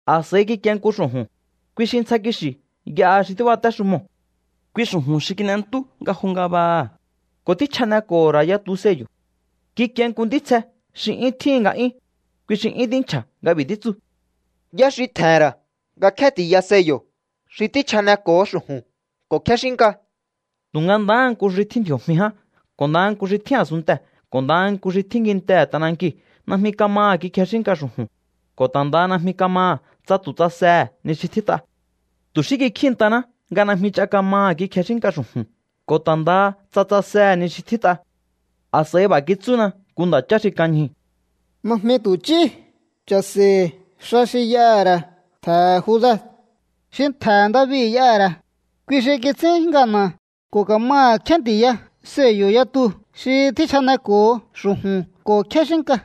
A̱s'a̱i kikie nku xu̱ju̱n, kui xi ntsja kixi̱ y'aha xi tíbatéxumoo̱. Kui xu̱ju̱n xi kin'entú nga jo ngabaha, ko̱ tjíchjaneko̱ho̱ ra̱ yatu sello̱. Kikie nku ntítsje xi 'yún tjíhi̱n nga'yún, kui xi 'yún tínchja̱ nga b'i̱ títsu: —¿Yá xi tje̱he̱n ra̱ nga kjénti̱ya sello̱ xi tjíchjaneko̱ho xu̱ju̱n ko̱ kjéxínnka? Tu̱nga ndahá nku xi tjín ndji̱o̱jmi ján ko̱ ndaha nku xi tjín a̱sunntee̱ ko̱ ndaha nku xi tjín kintehe̱ t'anankiu̱ najmi kamaha̱ kikjexínnka xu̱ju̱n, ko̱ ta̱ ndaha najmi kamaha̱ tsa tu̱ tsasehe̱ ni xi tjít'a. Tu̱ xí kikjíi̱ntaná nga najmi ch'a kamaha̱ kikjexínnka xu̱ju̱n ko̱ ta̱ ndaha tsa tsasehe̱ ni xi tjít'a. A̱s'a̱i b'a̱ kitsúna nku nda̱chá xi kan ñjuu̱: —Najmi tu̱ ch'í. Cha̱se̱i̱. Xa xi y'aha̱ ra̱ ntje̱he̱ Juda, xi ntje̱he̱ David y'aha̱ ra̱, kui xi kits'ín ngana̱ ko̱ ka̱maha̱ kjénti̱ya sello̱ yatu xi tjíchjaneko̱ho xu̱juṉ ko̱ kjéxínnka.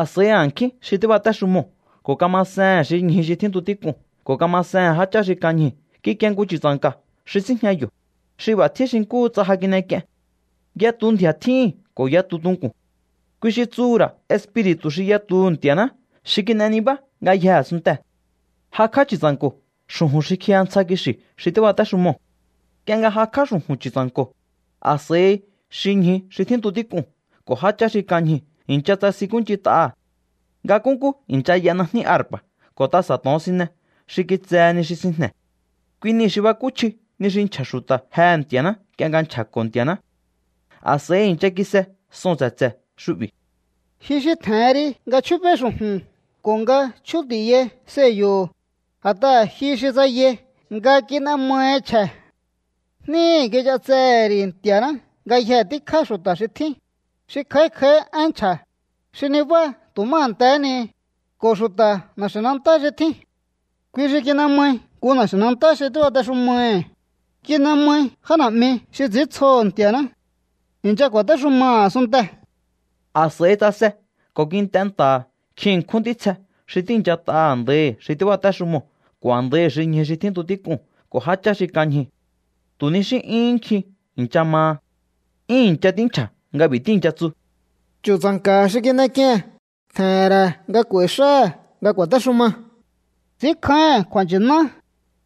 A̱s'a̱i a̱nkjín xi tíbatéxumoo̱ ko̱ kamasehe̱n xi ñju xi tjíntu tík'uu̱n ko̱ kamasehe̱n jáchá xi kan ñjuu̱ kikie nku Chu̱tsa̱nka̱ xi síjña yo̱, xi b'a̱ tjín xi nkúhu tsa ja kin'ek'ien. Yatu ndji̱a̱ tjíhi̱n ko̱ yatu tunku̱n. Kui xi tsuhu̱ ra̱ espiri̱tu̱ xi yatuhu̱ Nti̱a̱ná xi kin'e nibá ngayjee̱ a̱sunntee̱. Ngjikj'á Chu̱tsa̱nko̱ xu̱ju̱n xi kjiya ntsja kixi̱ xi tíbatéxumoo̱. Nk'ie nga jakj'á xu̱ju̱n Chu̱tsa̱nko̱, a̱s'a̱i xi ñju xi tjíntu tík'uu̱n ko̱ jáchá xi kan ñjuu̱ i̱ncha tsasinkúnch'int'aha̱. Nga nkúnkú i̱ncha y'a najní arpa̱ ko̱ tasa̱ to̱onsine xi kitsehe ni xi sinjne̱. Kui niu̱ xi bakúchji ni xi nchja̱ xu̱ta̱ jehe̱ Nti̱a̱ná nk'ie nga nchja̱ko̱ Nti̱a̱ná. A̱s'a̱i i̱ncha kise soo̱n tse̱tse̱ xu'bi̱: Ji xi tje̱hen ri nga chjúbéí xu̱ju̱n ko̱ nga chjúnti̱yai sello̱ho̱, a̱t'aha̱ ji xi tsayai nga kin'e mahi chje̱. Jníhi̱ kich'atsehe̱ ri̱ Nti̱a̱ná ngayjee̱ tíkjá xu̱ta̱ xi tjín, xi kj'a̱í kj'a̱í én nchja̱, xi nibá tu̱ má a̱ntehé ni, ko̱ xu̱ta̱ na̱xi̱nantá xi tjín. Kui xi kin'e mai nku na̱xi̱nantá xi tíbatexumaihi̱, kin'e mai já na̱'mi xi ts'i̱íntsjoho̱ Nti̱a̱ná. I̱ncha ku̱a̱téxumaha̱ a̱sunntee̱. A̱s'a̱i tsase ko̱ kint'e nta̱ha̱ nkjin ṉkjún ntítsje xi tíi̱nchat'a a̱ndaihi̱ xi tíbatéxumoo̱ ko̱ a̱ndaihi̱ xi ñju xi tjíntu tík'uu̱n ko̱ jáchá xi kan ñjuu̱. Tu̱ ni xí 'yúhún nkjin i̱ncha maha. 'Yún i̱ncha tínchja̱ nga b'i̱ tíi̱ncha tsu: Chu̱tsa̱nka̱ xi kin'ek'ie̱n tje̱he̱n ra̱ nga k'u̱a̱i̱ xáha̱ nga ku̱a̱téxuma. Ts'i̱ínkjáíhi̱n kju̱a̱nchi̱ná,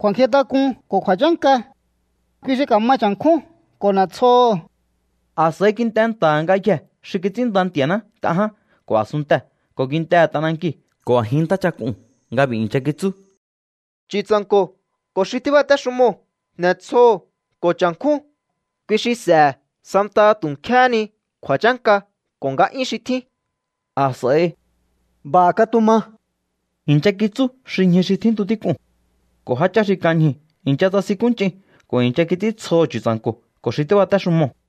kju̱a̱nkjintak'un ko̱ kju̱a̱chánka. Kui xi ka̱ma cha̱nkjún ko̱ n'e̱tsjoho̱. A̱s'a̱i kint'e nta̱ha̱ ngayjee̱ xi kits'ínnda Nti̱a̱ná nk'a ján ko̱ a̱sunntee̱ ko̱ kintehe̱ t'anankiu̱ ko̱ a̱jin ntáchak'uu̱n nga b'i̱ i̱ncha kitsú: Chu̱tsa̱nko̱ ko̱ xi tíbatéxumoo̱ n'e̱tsjoho̱ ko̱ cha̱nkjún. Kui xi s'e̱he̱ santaha tu̱ nkjéhé ni kju̱a̱chánka ko̱ nga'yún xi tjín. A̱s'a̱i —¡B'a̱ katuma! —i̱ncha kitsú xi ñju xi tjíntu tík'uu̱n. Ko̱ jáchá xi kan ñjuu̱ i̱ncha tsasinkúnch'in ko̱ i̱ncha kits'íntsjoho̱ Chu̱tsa̱nko̱ ko̱ xi tíbatéxumoo̱.